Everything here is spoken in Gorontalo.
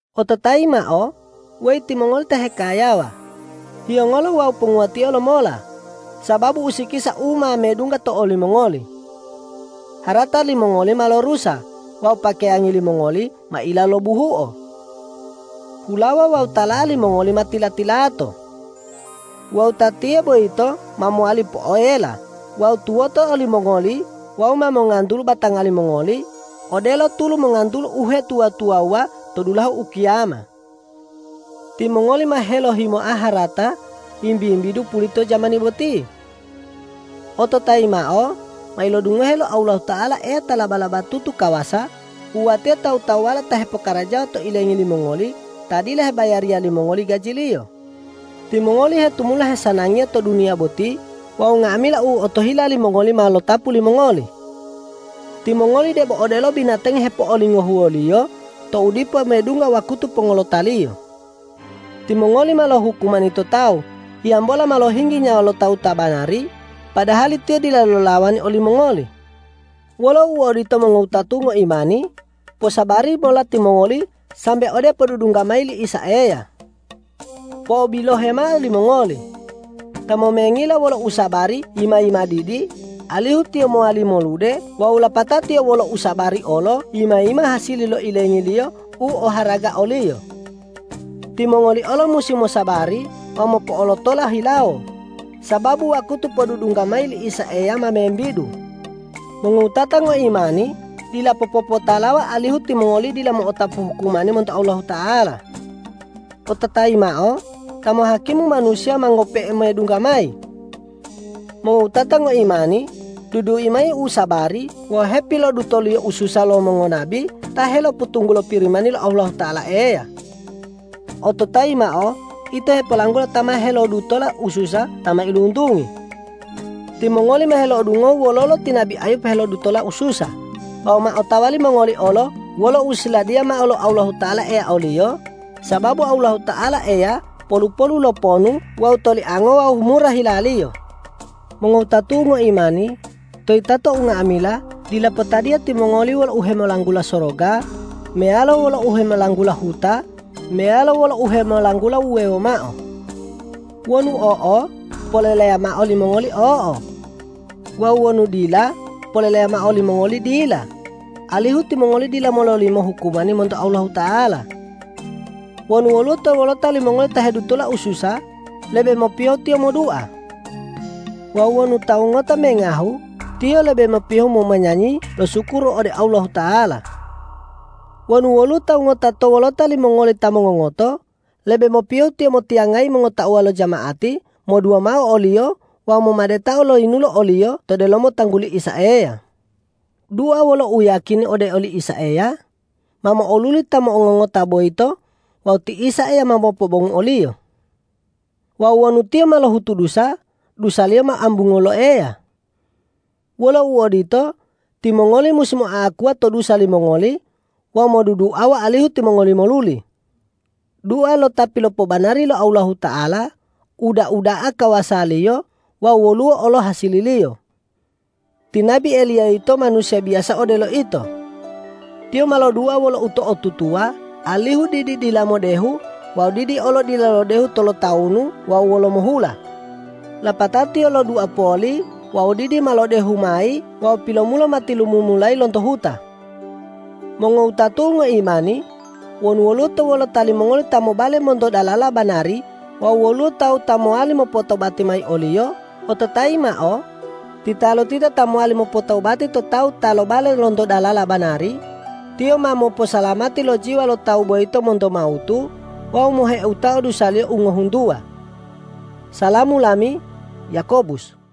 Ototayi mao, weyi timongoli ta hekayawa: Hiyongolo wawu ponguwatio lomola, sababu usikisa u ma medungga to olimongoli. Harata limongoli ma lorusa wawu pakeyangi limongoli ma ila lo buhuo. Hulawa wawu tala'a limongoli ma tila-tilato. Wawu tatiyo boyito ma mowali poela wawu tuwoto olimongoli wawu ma mongantulu batanga limongoli, odelo tulu mongantulu uhetuwa-tuwawuwa to dulahu ukiyama. Timongoli ma helohimoa harata wimbi-wimbidu pulito jamani boti. Ototayi mao, ma ilodungohe lo Allahuta'ala Eya ta laba-labatutu kawasa wuwatio tawu-tawuwala ta hepokarajawa to ilengi limongoli ta dila hebayariya limongoli gajiliyo. Timongoli hetumula hesanangiya to duniya boti wawu nga'amila u otohila limongoli ma lotapu limongoli. Timongoli debo odelo binatangi hepo'olingohuwoliyo tou dipo medungga wakutu pongolotaliyo. Timongoli ma lohukumani to tawu, hiyambola ma lohinggi nyawa lo tawu ta banari, padahali tiyo dila lolawani olimongoli. Wolo uodito mongowutatu'u ngoimani, posabari mola timongoli sambe ode podudungga mayi li Isa Eya. Po'obilohe mao limongoli: Ta momengila wolo usabari yima-yima didi, alihu tiyo mowali molude wawu lapatao tiyo wolo usabari olo yima-yima hasili lo ilengiliyo u oharaga oliyo. Timongoli olo musi mosabari wawu mopo'olotola hilawo, sababu wakutu podudungga mayi li Isa Eya ma membidu. Mongowutata ngoimani, dila popopotalawa alihu timongoli dila mo'otapu hukumani monto Allahuta'ala. Ototayi mao, Ta mohakimu manusiya ma ngope'e medungga mayi. Mongowutata ngoimani, dudui mao usabari wawu hepilodutoliyo ususa lo mongonabi ta helopotunggulo Pirimani lo Allahuta'ala Eya. Ototayi mao, ito hepolanggula ta ma helodutola ususa ta mailuntungi. Timongoli ma helo'odungohu wololo ti nabi Ayub helodutola ususa wawu ma otawa limongoli olo wolo u siladiya mao lo Allahuta'ala Eya oliyo, sababu Allahuta'ala Eya polu-polu lo ponu wawu toliango wawu mura hila-Liyo. Mongowutatu'u ngoimani, to yitato unga'amila dila potadiya timongoli wolo uhemolanggula soroga meyalo wolo uhemolanggula huta meyalo wolo uhemolanggula uwewo mao. Wonu o'o, poleleya mao limongoli o'o; wawu wonu dila, poleleya mao limongoli dila, alihu timongoli dila mololimo hukumani monto Allahuta'ala. Wonu woluwo to wolota limongoli ta hedutola ususa, lebe mopiyohu tiyo modua. Wawu wonu tawu ngota mengahu, tiyo lebe mopiyohu momanyanyi losukuru ode Allahuta'ala. Wonu woluwo tawu ngota to wolota limongoli ta mongongoto, lebe mopiyohu tiyo motiyangayi mongotauwa lo jama'ati modua mao oliyo wawu momadetao lo yinulo oliyo to delomo tangguli Isa Eya. Dua wolo uyiyakini ode oli Isa Eya, ma mo'oluli ta mongongota boyito wawu ti Isa Eya ma mopobongu oliyo. Wawu wonu tiyo ma lohutu dusa, dusaliyo ma ambunguwo lo Eya. Wolo uodito, timongoli musi moa'akuwa to dusa limongoli wawu moduduawa alihu timongoli moluli. Dua lo ta pilopobanari lo Allahuta'ala, uda'a da'a kawasaliyo wawu woluwo olo hasililiyo. Ti nabi Eliya yito manusiya biyasa odelo ito. Tiyo ma lodua wolo uto'otutuwa, alihu didi dila modehu wawu didi olo dila lodehu tolotawunu wawu wolomo hula. Lapatao tiyo lodua poli wawu didi ma lodehu mayi wawu pilomulo ma tilumumulayi lonto huta. Mongowutatu'u ngoimani, wonu woluwo to wolota limongoli ta mobale monto dalala banari wawu woluwo tawu ta mowali mopotobati mayi oliyo, ototayi mao: Titalotita ta mowali mopotobati to tawu ta lobale lonto dalala banari, tiyo ma moposalamati lo jiwa lo tawu boyito monto mawutu wawu moheutao dusaliyo u ngohuntuwa. Salamu lami, Yakobus